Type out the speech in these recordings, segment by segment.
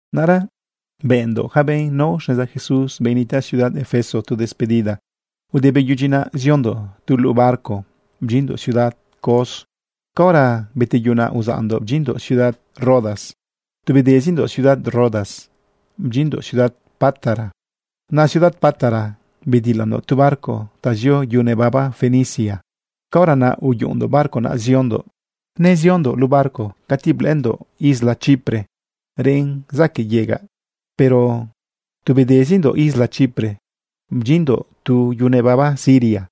Naꞌra bëꞌndoꞌ ja benꞌ nao xneza Jesús, benꞌ nitaꞌ ciudad Efeso, tu despedida. Ude beyudyi naꞌ, ziondoꞌ tu luꞌu barco bdyinndoꞌ ciudad Cos. Caora beteyunaꞌ, uzaꞌndoꞌ bdyinndoꞌ ciudad Rodas. Tu bedezindoꞌ ciudad Rodas, bdyinndoꞌ ciudad Pátara. Naꞌ ciudad Pátara bedilandoꞌ tu barco ta zio yu nebaba Fenicia. Caora naꞌ uyuꞌundoꞌ barco naꞌ ziondoꞌ. Neziondoꞌ luꞌu barco cati blëꞌëndoꞌ isla Chipre reꞌn zaquëꞌ yegaꞌ, pero tu bedezindoꞌ isla Chipre bdyinndoꞌ yu nebaba Siria.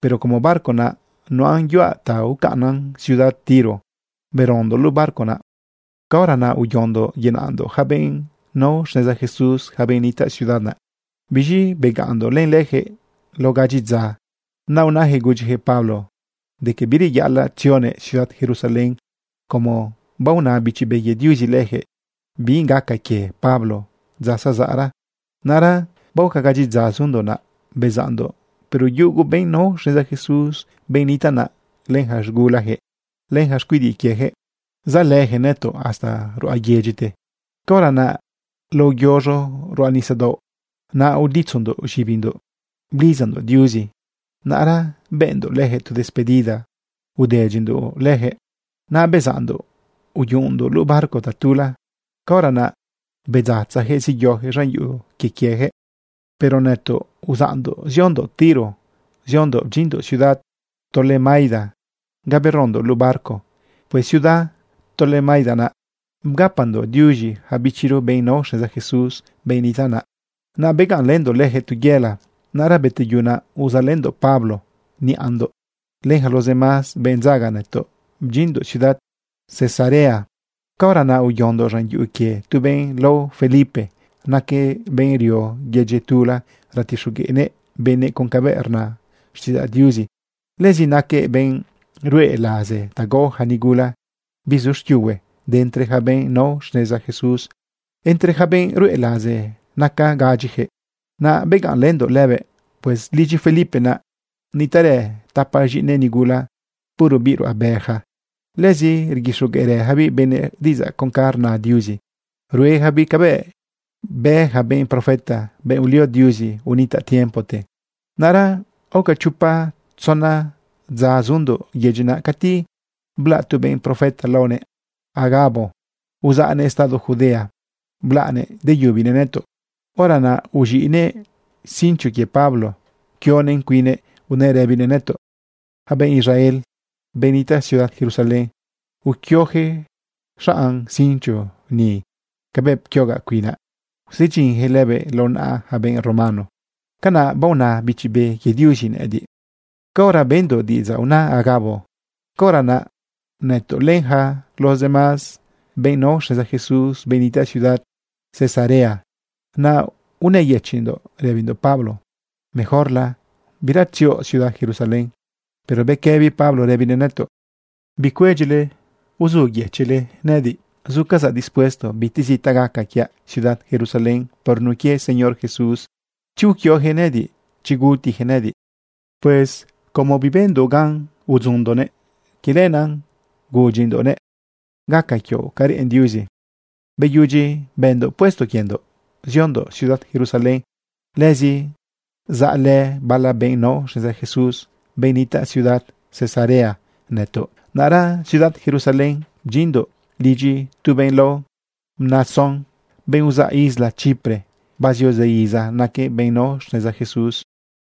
Pero como barco naꞌ nuꞌan yuaꞌ ta ucaꞌnnan ciudad Tiro, berondoꞌ luꞌu barco naꞌ. Caora naꞌ uyondoꞌ yenaꞌndoꞌ yaca benꞌ nao xneza Jesús, yaca benꞌ nitaꞌ ciudad naꞌ. Biz̃i begaꞌnndoꞌ len leyaquëꞌ lao gadyi dza. Naꞌ unayaquëꞌ gudyiyaquëꞌ Pablo de que bireyaꞌalaꞌ tzionëꞌ ciudad Jerusalén como baona Bichi Be quie Diuzi leyaquëꞌ bi gaca quie Pablo dza zazaꞌra. Naꞌra baoca gadyi dza zundoꞌ naꞌ, bezaꞌndoꞌ, pero yugu benꞌ nao xneza Jesús, benꞌ nitaꞌ naꞌ, len yaca z̃gulayaquëꞌ, len yaca xcuidiꞌ quiejëꞌ, zaꞌlëyaquëꞌ nëtoꞌ hasta ruꞌa yedyite. Caora naꞌ lao yoz̃o ruꞌa nisadaoꞌ naꞌ, uditzondoꞌ z̃ibindoꞌ blidzandoꞌ Diuzi. Naꞌra bëꞌndoꞌ lejëꞌ tu despedida udedyindoꞌ leyaquëꞌ. Naꞌ bezaꞌndoꞌ uyuꞌundoꞌ luꞌu barco tatula. Caora naꞌ bedzatzajëꞌ zeyojëꞌ z̃an yuꞌu quie quiejëꞌ. Pero nëtoꞌ uzaꞌndoꞌ ciudad Tiro ziondoꞌ bdyinndoꞌ ciudad Tolemaida ga berondoꞌ luꞌu barco. Pues ciudad Tolemaida naꞌ bgapandoꞌ diuz̃i yaca bichiro benꞌ nao xneza Jesús, benꞌ nitaꞌ naꞌ. Naꞌ begaꞌnlëndoꞌ lejëꞌ tu yëla. Naꞌra beteyu naꞌ, uzaꞌlëndoꞌ Pablo niꞌandoꞌ len yaca los demás benꞌ dzaga nëtoꞌ bdyinndoꞌ ciudad Cesarea. Caora naꞌ uyondoꞌ z̃an yuꞌu quie tu benꞌ lao Felipe. Naquëꞌ benꞌ rio yedyi tula ratixogueꞌnëꞌ benëꞌ con cabëꞌ rna xtiꞌidzaꞌ Diuzi. Lëzi naquëꞌ benꞌ ruꞌe laze ta gao ja nigula bizu xquiuhue de entre ja benꞌ nao xneza Jesús. Entre ja benꞌ ruꞌe laze naca gadyijëꞌ. Naꞌ begaꞌnlëndoꞌ lëbëꞌ. Pues lidyi Felipe naꞌ nitaꞌrë tapa z̃iꞌinëꞌ nigula, puro biꞌ ruꞌabe yaca. Lëzi rguixogueꞌrëjabiꞌ benëꞌ diꞌidzaꞌ con ca rna Diuzi. Ruejabiꞌ cabëꞌ bë ja benꞌ profeta, benꞌ ulio Diuzi unitaꞌ tiempote. Naꞌra aoca chopa tzona dza zundoꞌ yedyi naꞌ, cati blaꞌ tu benꞌ profeta laonëꞌ Agabo. Uzaꞌnëꞌ estado Judea blaꞌnëꞌ deyubinëꞌ nëtoꞌ. Hora naꞌ uz̃iꞌnëꞌ cincho quie Pablo pquionëꞌn cuinnëꞌ unëꞌ rëbinëꞌ nëtoꞌ: ―Yaca benꞌ Israel, benꞌ nitaꞌ ciudad Jerusalén, uquiojëꞌ xanꞌ cincho ni cabëꞌ pquiogaꞌ cuinaꞌ, usedyinyaquëꞌ lëbëꞌ lao naꞌa ja benꞌ romano. Canaꞌ baona Bichi Be quie Diuzi nëꞌëdiꞌ. Caora bendoꞌ diꞌidzaꞌ una Agabo, caora naꞌ nëtoꞌ len yaca los demás benꞌ nao xneza Jesús, benꞌ nitaꞌ ciudad Cesarea naꞌ, unëyëchiꞌndoꞌ rëbindoꞌ Pablo: ―Mejorla bira tzioꞌ ciudad Jerusalén. Pero bequëbi Pablo rëbinëꞌ nëtoꞌ: ―Bicuedyile uzuyëchiꞌle nëꞌëdiꞌ. Zucazaꞌ dispuesto bitezi ta gaca quiaꞌ ciudad Jerusalén por nun quie Señor Jesús, chi uquiojëꞌ nëꞌëdiꞌ, chi gutiyaquëꞌ nëꞌëdiꞌ. Pues como bibëndoꞌ gan udzundoꞌnëꞌ, quie lenaꞌ gudyindoꞌnëꞌ: ―Gaca quioꞌ ca reꞌen Diuzi. Beyudyi bëndoꞌ puesto quiendoꞌ, ziondoꞌ ciudad Jerusalén. Lëzi zaꞌlë bala benꞌ nao xneza Jesús, benꞌ nitaꞌ ciudad Cesarea, nëtoꞌ. Naꞌra ciudad Jerusalén bdyinndoꞌ lidyi tu benꞌ lao Mnasón, benꞌ uzaꞌ Isla Chipre. Bazio zë iza naquëꞌ benꞌ nao xneza Jesús.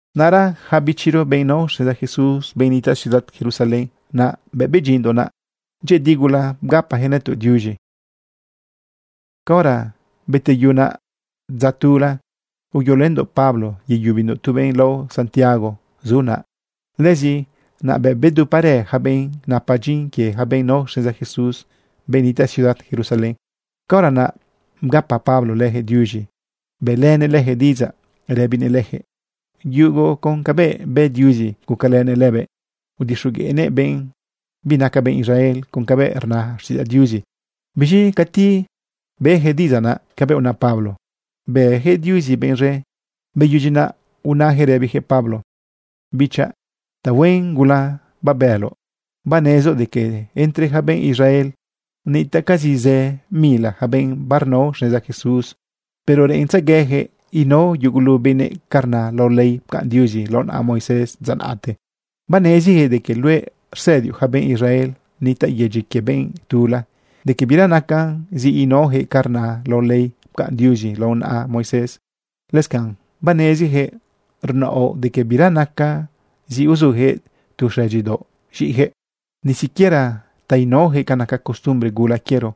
Naꞌra yaca bichiro, benꞌ nao xneza Jesús, benꞌ nitaꞌ ciudad Jerusalén naꞌ, bëꞌ bdyinndoꞌ naꞌ, dyëꞌëdi gula bgapayaquëꞌ nëtoꞌ diuz̃i. Caora beteyu naꞌ dza tula, uyolëndoꞌ Pablo yeyubindoꞌ tu benꞌ lao Santiago zu naꞌ. Lëzi naꞌ beduparë yaca benꞌ napa dyin quie ja benꞌ nao xneza Jesús, benꞌ nitaꞌ ciudad Jerusalén. Caora naꞌ bgapa Pablo leyaquëꞌ diuz̃i bëꞌlënëꞌ leyaquëꞌ diꞌidzaꞌ rëbinëꞌ lejëꞌ yugu con cabëꞌ bë Diuzi gucalënëꞌ lëbëꞌ udixogueꞌnëꞌ benꞌ binaca benꞌ Israel con cabëꞌ rna xtiꞌidzaꞌ Diuzi. Biz̃i cati beyaquëꞌ diꞌidzaꞌ naꞌ cabëꞌ una Pablo, bëjëꞌ Diuzi benꞌ z̃e. Beyudyi naꞌ, unayaquëꞌ rëbiyaquëꞌ Pablo: ―Bichaꞌ, tahuen gula babëloꞌ. Banezoꞌ de que entre yaca benꞌ Israel nitaꞌcazi zë mila yaca benꞌ barnao xneza Jesús, pero reꞌentzegueyaquëꞌ inao yugulu benëꞌ ca rna lao ley pcaꞌn Diuzi lao naꞌa Moisés dza naꞌte. Baneziyaquëꞌ de que luëꞌ rsëdioꞌ yaca benꞌ Israel nitaꞌ yedyi quie benꞌ tula de que bira nacan zi inaojëꞌ ca rna lao ley pcaꞌn Diuzi lao naꞌa Moisés. Lëscanꞌ baneziyaquëꞌ rnaoꞌ de que bira nacan zi uzuyaquëꞌ tu xëdyidaoꞌ z̃iꞌiyaquëꞌ, ni siquiera ta inaoyaquëꞌ ca naca costumbre gula quiero.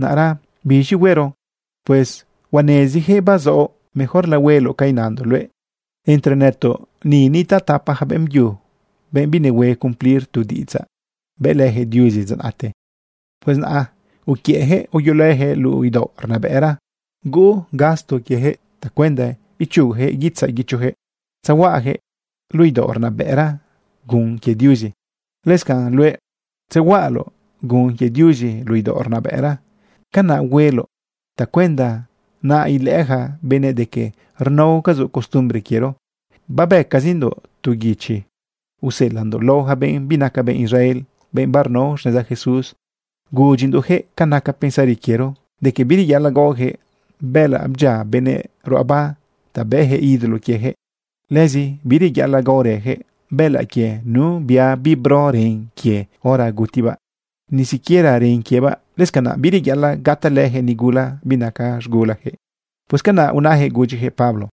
Naꞌra ¿biz̃i huero? Pues huaneziyaquëꞌ bazaoꞌ. Mejorla hueloꞌ ca inandoꞌ luëꞌ. Entre nëtoꞌ ni nitaꞌ tapa ja beꞌmbyu, benꞌ binehue cumplir tu diꞌidzaꞌ bëꞌlëyaquëꞌ Diuzi dza naꞌte. Pues naꞌ uquiëꞌjëꞌ uyolëjëꞌ luꞌu idaoꞌ rnabëꞌra, huuꞌ gasto quiejëꞌ tacuenda ichugojëꞌ guitzaꞌ guichojëꞌ tzehuaꞌajëꞌ luꞌu idaoꞌ rnabëꞌra gun quie Diuzi. Lëscanꞌ luëꞌ tzehuaꞌaloꞌ gun quie Diuzi luꞌu idaoꞌ rnabëꞌra. Canaꞌ hueloꞌ tacuenda naꞌ ilëꞌë yaca benëꞌ de que rnaocazoꞌ costumbre quiero. Babëcazindoꞌ tu guichi useꞌelaꞌndoꞌ lao yaca benꞌ binaca benꞌ Israel, benꞌ barnao xneza Jesús, gudyindoꞌjëꞌ ca naca pensari quiero de que bireyaꞌalaꞌ gaojëꞌ bëꞌëlaꞌ bdyia benëꞌ ruꞌaba ta bëꞌyaquëꞌ ídolo quiejëꞌ. Lëzi bireyaꞌalaꞌ gaorëyaquëꞌ bëꞌëlaꞌ quie nu bia bibro ren quie hora gutibaꞌ, ni siquiera ren quiebaꞌ. Lëscanaꞌ bireyaꞌalaꞌ gatalëjëꞌ nigula binaca z̃gulajëꞌ. ―Pues canaꞌ unayaquëꞌ gudyijëꞌ Pablo.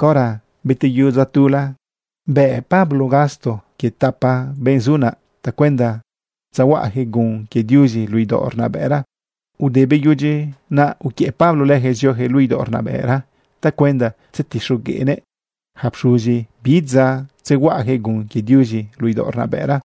Caora beteyu dza tula, bë Pablo gasto quie tapa benꞌ zu naꞌ tacuenda tzahuaꞌayaquëꞌ gun quie Diuzi luꞌu idaoꞌ rnabëꞌra. Ude beyudyi naꞌ, uquiëꞌ Pablo leyaquëꞌ zioyaquëꞌ luꞌu idaoꞌ rnabëꞌra tacuenda tzetixogueꞌnëꞌ yaca pxuzi bi dza tzehuaꞌajëꞌ gun quie Diuzi luꞌu idaoꞌ rnabëꞌra.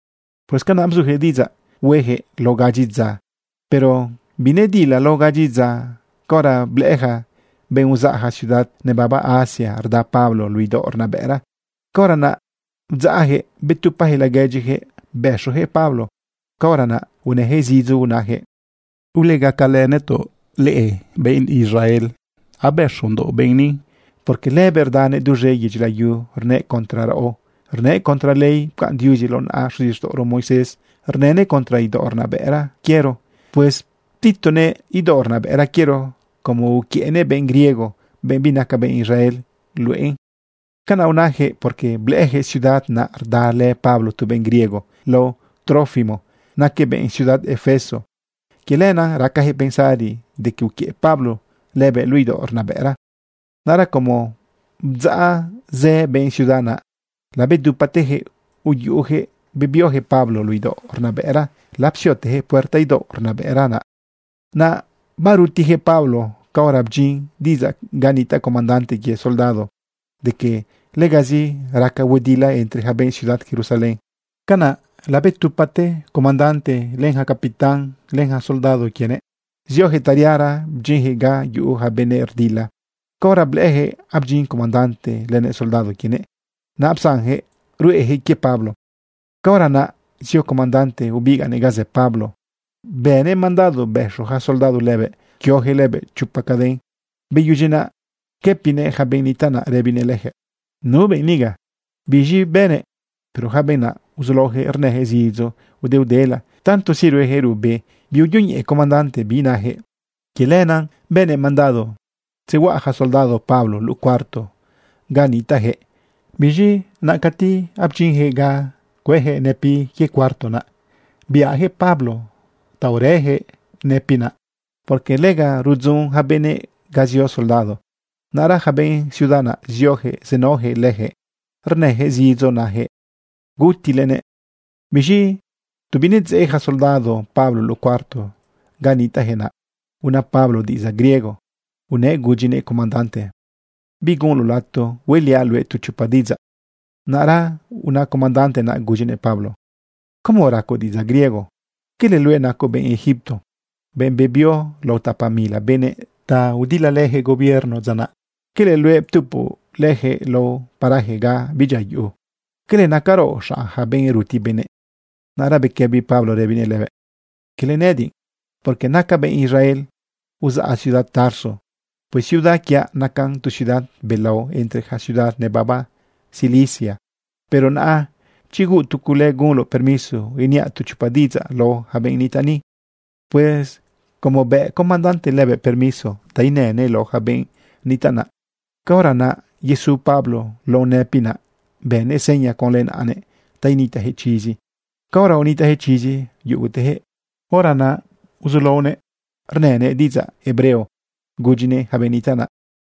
Pues canaꞌ bzujëꞌ diꞌidzaꞌ huejëꞌ lao gadyi dza, pero binedila lao gadyi dza caora blëꞌë yaca benꞌ uzaꞌ ja ciudad nebaba Asia rda Pablo luꞌu idaoꞌ rnabëꞌra. Caora naꞌ bdzaꞌjëꞌ betupajëꞌ laguedyijëꞌ bëxoyaquëꞌ Pablo. Caora naꞌ unëyaquëꞌ zidzo unayaquëꞌ: ―¡Ulegacalë nëtoꞌ, leꞌe benꞌ Israel! Abëxondoꞌ benꞌ ni, porque lëbëꞌ rdanëꞌ duz̃e yedyi layu rnënëꞌ contra raꞌo, rnënëꞌ contra ley pcaꞌn Diuzi lao naꞌa xuzixtaꞌoro Moisés, rnënëꞌ contra idaoꞌ rnabëꞌra quiero. Pues ptitonëꞌ idaoꞌ rnabëꞌra quiero como uquiëꞌnëꞌ benꞌ griego, benꞌ binaca benꞌ Israel, luꞌe ni. Canaꞌ unayaquëꞌ, porque blëꞌëyaquëꞌ ciudad naꞌ rdalë Pablo tu benꞌ griego lao Trófimo. Naquëꞌ benꞌ ciudad Efeso. Quie lenaꞌ racajëꞌ pensari de que uquiëꞌ Pablo lëbëꞌ luꞌu idaoꞌ rnabëꞌra naꞌ. Naꞌra como bdzaꞌ zë benꞌ ciudad naꞌ, labedupatejëꞌ uyuꞌujëꞌ bebiojëꞌ Pablo luꞌu idaoꞌ rnabëꞌra lapsiotejëꞌ puerta idaoꞌ rnabëꞌra naꞌ. Naꞌ barutiyaquëꞌ Pablo caora bdyin diꞌidzaꞌ ga nitaꞌ comandante quie soldado de que legazi raca huedila entre yaca benꞌ ciudad Jerusalén. Canaꞌ labedupate comandante, len yaca capitán, len yaca soldado quienëꞌ, zioyaquëꞌ tariara bdyinyaquëꞌ ga yuꞌu ja benëꞌ rdila. Caora blëꞌëyaquëꞌ abdyin comandante lënëꞌ soldado quienëꞌ, naꞌ psanjëꞌ ruꞌeyaquëꞌ quie Pablo. Caora naꞌ zio comandante ubigaꞌnëꞌ ga zë Pablo, bënëꞌ mandado bëxo yaca soldado lëbëꞌ pquioyaquëꞌ lëbëꞌ chopa caden. Beyudyi naꞌ, pquëpinëꞌ yaca benꞌ nitaꞌ naꞌ rëbinëꞌ leyaquëꞌ: ―¿Nu benꞌ niga? ¿Biz̃i bënëꞌ? Pero yaca benꞌ naꞌ uzulaoyaquëꞌ rnëyaquëꞌ zidzo udeudela. Tantozi rueyaquëꞌ ruꞌbe, biuyoñeꞌe comandante bi nayaquëꞌ. Que lenaꞌ bënëꞌ mandado tzehuaꞌa yaca soldado Pablo luꞌu cuarto ga nitaꞌjëꞌ. Biz̃i naꞌ cati abdyinyaquëꞌ ga cuëyaquëꞌ nëpiꞌ quie cuarto naꞌ, biꞌayaquëꞌ Pablo ta urëyaquëꞌ nëpiꞌ naꞌ, porque lega rudzun yaca benëꞌ ga zio soldado. Naꞌra yaca benꞌ ciudad naꞌ ziojëꞌ zenaoyaquëꞌ lejëꞌ rnëyaquëꞌ zidzo najëꞌ: ―¡Gutilenëꞌ! Biz̃i tu binedzeꞌ ja soldado Pablo luꞌu cuarto ga nitaꞌjëꞌ, naꞌ una Pablo diꞌidzaꞌ griego unëꞌ gudyinëꞌ comandante: ―¿Bigunloꞌ lato hueꞌliaꞌ luëꞌ tu chopa diꞌidzaꞌ? Naꞌra una comandante naꞌ gudyinëꞌ Pablo: ―¿Cómo racoꞌ diꞌidzaꞌ griego? ¿Quele luëꞌ nacoꞌ benꞌ Egipto, benꞌ bebio lao tapa mila benëꞌ ta udilalëyaquëꞌ gobierno dza naꞌ? ¿Quele luëꞌ ptupoꞌ leyaquëꞌ lao paraje ga bidyia yuꞌu? ¿Quele nacaraoꞌ xanꞌ ja benꞌ ruti benëꞌ? Naꞌra bequëbi Pablo rëbinëꞌ lëbëꞌ: ―Quele nëꞌëdiꞌ, porque nacaꞌ benꞌ Israel. Uzaꞌ ciudad Tarso. Pues ciudad quiaꞌ nacan tu ciudad belao entre yaca ciudad nebaba Cilicia. Pero naꞌa chi huuꞌ tu cule, gunloꞌ permiso iniaꞌ tu chopa diꞌidzaꞌ lao yaca benꞌ nitaꞌ ni. Pues como bëꞌ comandante lëbëꞌ permiso ta inënëꞌ lao yaca benꞌ nitaꞌ naꞌ, caora naꞌ yesu Pablo lao nëpiꞌ naꞌ, bënëꞌ seña conlë naꞌanëꞌ ta initaꞌyaquëꞌ chizi. Caora unitaꞌyaquëꞌ chizi yugutejëꞌ, hora naꞌ uzulaonëꞌ rnënëꞌ diꞌidzaꞌ hebreo gudyinëꞌ ja benꞌ nitaꞌ naꞌ: